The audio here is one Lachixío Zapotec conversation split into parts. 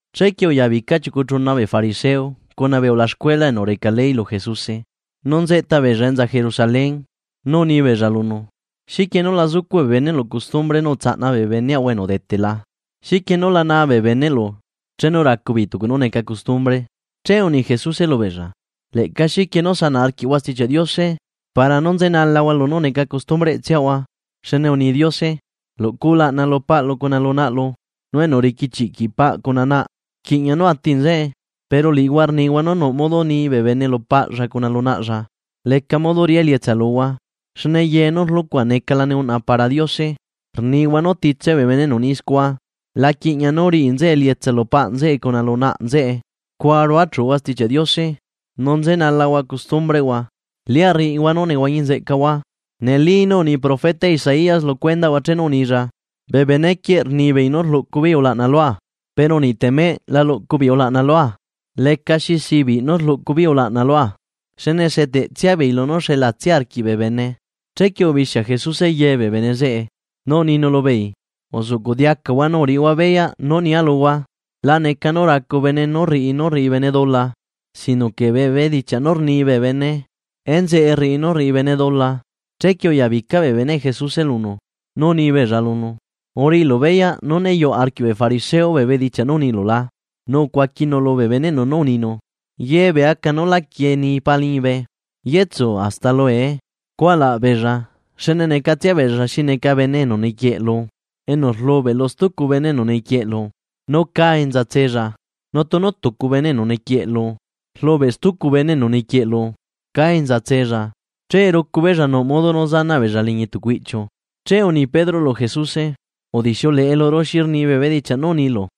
Chequie uyabica chiucu chuna bee fariseo cuna bee ulaxcuela enu reca ley lu Jesuse, nu nzeꞌta beella enza Jerusalén, nu uni beella lunu: ―¿Xiquie núla zucuꞌ bee beneꞌlu custumbre nú utsaꞌna bee beneꞌahua enu udetela? ¿Xiquie núla naa bee beneꞌlu chenu racu beei tucu nú neca custumbre? Che uni Jesuse lubeella: ―¿Leꞌca xiquie nú sanaꞌ arquiꞌhua Stichiaꞌ Diose, para nú nzenalahua lunú neca costumbreꞌtsiahua? Xne uni Diose: “Luꞌcu ulaꞌna lu paꞌlu cuna lu naꞌlu”, nu “Enu riquichiꞌquiꞌ paꞌ cuna naꞌ rquiꞌña nú ati nzeꞌe.” Pero liꞌihua rnihua nú nuꞌ modo ni bene lu paꞌlla cuna lu naꞌlla: “Leca modo riꞌá elietsa luhua, xne ye nú rluꞌcua necalane uꞌna para Diose”, rnihua nú titse bee bene enu ni scua, la quiꞌñia nú riꞌi nzeꞌe elietsa lu paꞌ nzeꞌe cuna lu naꞌ nzeꞌe. Scua ruachuhua Stichiaꞌ Diose, nu nzenalahua costumbreꞌhua. ¡Lia rriꞌihua nú nehuañi nzeꞌcahua! Neli nú uni profeta Isaías lu cuendaꞌhua chenu unilla: Bee benequieꞌ rnibeei nú rluꞌcu beei ulaꞌna lua, pero niꞌ temeꞌ la luꞌcu beei ulaꞌna lua. Lecaxi sibiꞌ nú rluꞌcu beei ulaꞌna lua, xne seteꞌtsia beei lunú xelatsia arquiꞌ bee bene. Chequie ubixia Jesuse ye bee bene zeꞌe, nu uninu lubeei: ―Uzuꞌcuꞌ diacahua nu uriꞌihua beyaꞌ nú nia luhua: La neca nú racu bene nú rriꞌi, nú rriꞌi bene dula. Sino que bee bedichiaꞌ nú rni bene enzeꞌe rriꞌi nú rriꞌi bene dula. Chequie uyabica bee beneꞌ Jesuse lunu nu uni beella lunu: ―¿Uriꞌilu beyaꞌ nú né yuꞌ arquiꞌ bee fariseo bee bedichiaꞌ nú unilu la? Nu ucuaquinu lubee beneꞌnu nú uninu: ―Ye bee aca nú lá quieni Paa liñibe yetsu hasta lue. Cualaꞌ beella, xne necatsia beella xi neca bene enu nequieꞌlu enu rlubeꞌ lu stucu bene enu nequieꞌlu nú cá enza tsella, nu tunu tucu bene enu nequieꞌlu rlubeꞌ stucu bene enu nequieꞌlu cá enza tsella, che rucu beella nuꞌ modo nú zanaꞌ beella liñi tucu iꞌchiu. Che uni Pedro lu Jesuse: ―Udixiuleꞌe luru xi rni bee bedichiaꞌ nú unilu.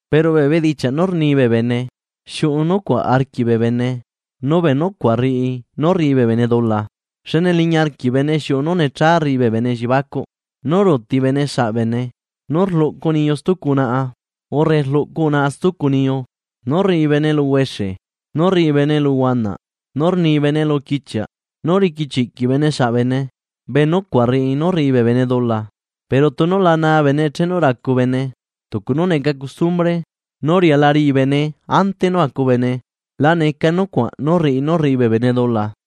Pero bee bedichiaꞌ nú rni bee bene, xiuꞌu nucuaꞌ arquiꞌ bee bene, nu bee nucuaꞌ rriꞌi nú rriꞌi bee bene dula. Xne liñi arquiꞌ bene xiuꞌu nú necha rriꞌi bene elliebacuꞌ, nú ruuti bene saꞌbene, nú rluꞌcu niyu stucu unaꞌa, urre rluꞌcu unaꞌa stucu niyu, nú rriꞌi bene eluhuexe, nú rriꞌi bene eluhuanaꞌ, nú rni bene eluquichiaꞌ, nú riquichiꞌquiꞌ bene saꞌ bene. Bee nucuaꞌ rriꞌi nú rriꞌi bee bene dula. Pero tunu la naa bene chenu racu bene tucu nú neca custumbre nú riala riꞌi bene ante nú acu bene, la neca nucuaꞌ nú rriꞌi nú rriꞌi bee bene dula.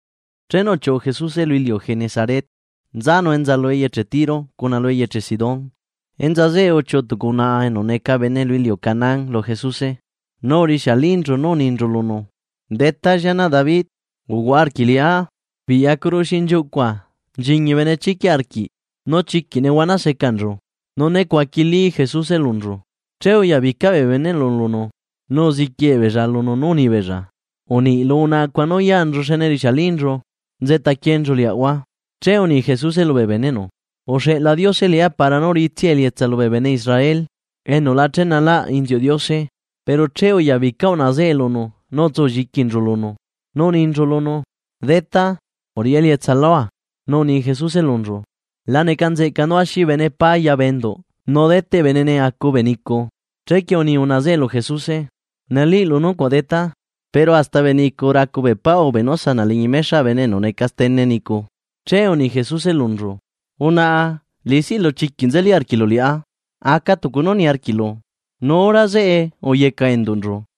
Chenu uchiuꞌu Jesuse lu iliu Genesaret nzanu enza lu eyeche Tiro cuna lu eyeche Sidón. Enza zeꞌe uchiuꞌu tucu unaꞌa enu neca bene lu iliu Canaán lu Jesuse nu urixialinchu nú uninchu lunu: ―¡Detá, llianaꞌ David, uhuaꞌa arquiꞌ liꞌá! Biꞌyacuru xinchiuꞌcua nchiñi benechiquiꞌ arquiꞌ nu chiquiꞌ nehuana secanchu. Nu né cuaquilí Jesuse lunchu. Che uyabica bee beneꞌnu lunu nu uziquie beella lunu nú uni beella: ―Uniꞌ lu unaꞌa cuaꞌ nú yanchu xne rixialinchu nzeꞌtaquienchu liaꞌahua. Che uni Jesuse lubee beneꞌnu: ―Uxeꞌla Diose liꞌá para nú riꞌitsia elietsa lubee bene Israel enu la chenalaꞌ inziuꞌ Diose. Pero che uyabica unaꞌa zeꞌe lunu nu utsulliquinchu lunu, nú uninchu lunu: ―¡Detá, uriꞌi elietsa lua! Nu uni Jesuse lunchu: ―La neca nzeꞌca nú axi bene pá ya bee enduꞌ nu deteꞌ benene acu bee nicu. Chequie uni unaꞌa zeꞌe lu Jesuse: ―Neliꞌlu nucuaꞌ Detá, pero hasta bee nicu racu bee pá ube nú sanaꞌ liñi mexaꞌ bene enu neca stene nicu. Che uni Jesuse lunchu: ―¡Unaꞌa liꞌisiꞌlu chiquiꞌ nzeli arquiꞌlu liꞌá! Aca tucu nú niarquiꞌlu. Nu hora zeꞌe, uyecaꞌ enduꞌnchu.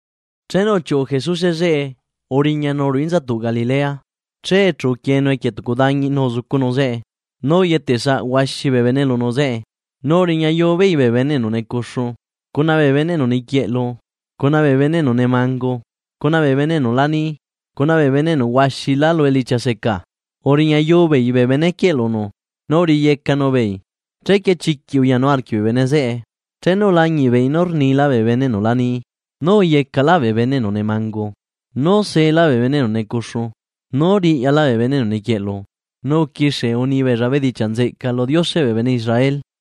Chenu uchiuꞌu Jesuse zeꞌe uriñanu ruꞌu inzatuꞌ Galilea. Che chu uquienu equie tucu dañi nu uzucunu zeꞌe. Nu uyetesaꞌ huaxi bee bene lunu zeꞌe, nu uriñayu beei bee bene enu necuxu, cuna bee bene enu niquieꞌlu, cuna bee bene enu nemangu, cuna bee bene enu la ni, cuna bee bene enu seca huaxilá lu elichia. Uriñayu beei bee bene quieꞌ lunu, nu uriyecanu beei. Chequie chiquiꞌ uyanu arquiꞌ bee bene zeꞌe chenu ulañiꞌ beei nú rnila bee bene enu lani, nú uyecalaꞌ bee bene enu nemangu, nú sela bee bene enu necuxu, nú riꞌyala bee bene enu niquieꞌlu. Nu uquixie uni beella bedichiaꞌ nzeꞌca lu Dioseꞌ bee bene Israel.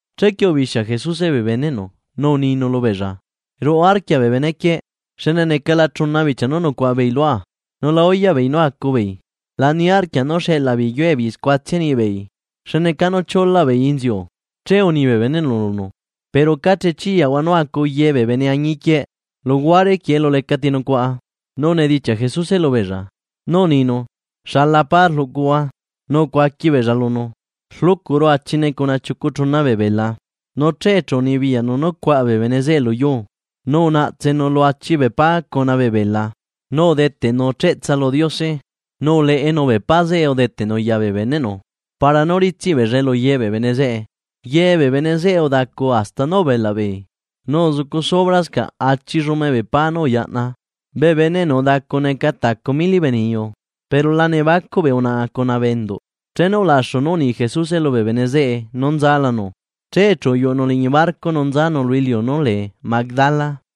Chequie ubixia Jesuse bee beneꞌnu nu uninu lubeella: ―Ruꞌu arquia bee benequieꞌ, xne necala chuna bichia nú nucuaꞌa beei lua nu la uyaꞌ beei nú acu beei. La niarquia nú xeꞌlaa beei yue beei scuatsia niꞌi beei, xne cá chiulaꞌ beei inziu. Che uni bee beneꞌnu lunu: ―Pero ¿ca chiyaꞌahua nú acu ye bee bene añiquieꞌ, luhuare quieꞌ elu lecati nucuaꞌa? Nu unedichiaꞌ Jesuse lubeella, nú uninu: ―¿Xala pa rluꞌcuhua? Nu ucuaqui beella lunu: ―Rluꞌcuru achine cuna chiucu chuna bee bela. Nu che chu unibiyaꞌnu nú cuaꞌa bee bene zeꞌe luyuu. Nu unaꞌtsenu lu achi bee pa cuna bee bela, nu udeteꞌnu cheꞌtsa lu Diose. Nu uleꞌenu bee pa zeꞌe udeteꞌnu ya bee beneꞌnu para nú ritsiꞌ beellae luye bee bene zeꞌe. Ye bee bene zeꞌe udacu hasta nú ubelaꞌ beei. Nu uzucu subrascaꞌ achi llume bee pa nú uyaꞌna. Bee bene enu udacu neca tacu mili bee niyu, pero la nebacuꞌ bee unaꞌa cuna bee enduꞌ. Chenu ulaxu nú uni Jesuse lubee bene zeꞌe nú nzalanu. Che chu uyuꞌunu liñi barco nu nzanu lu iliu nú lee Magdala.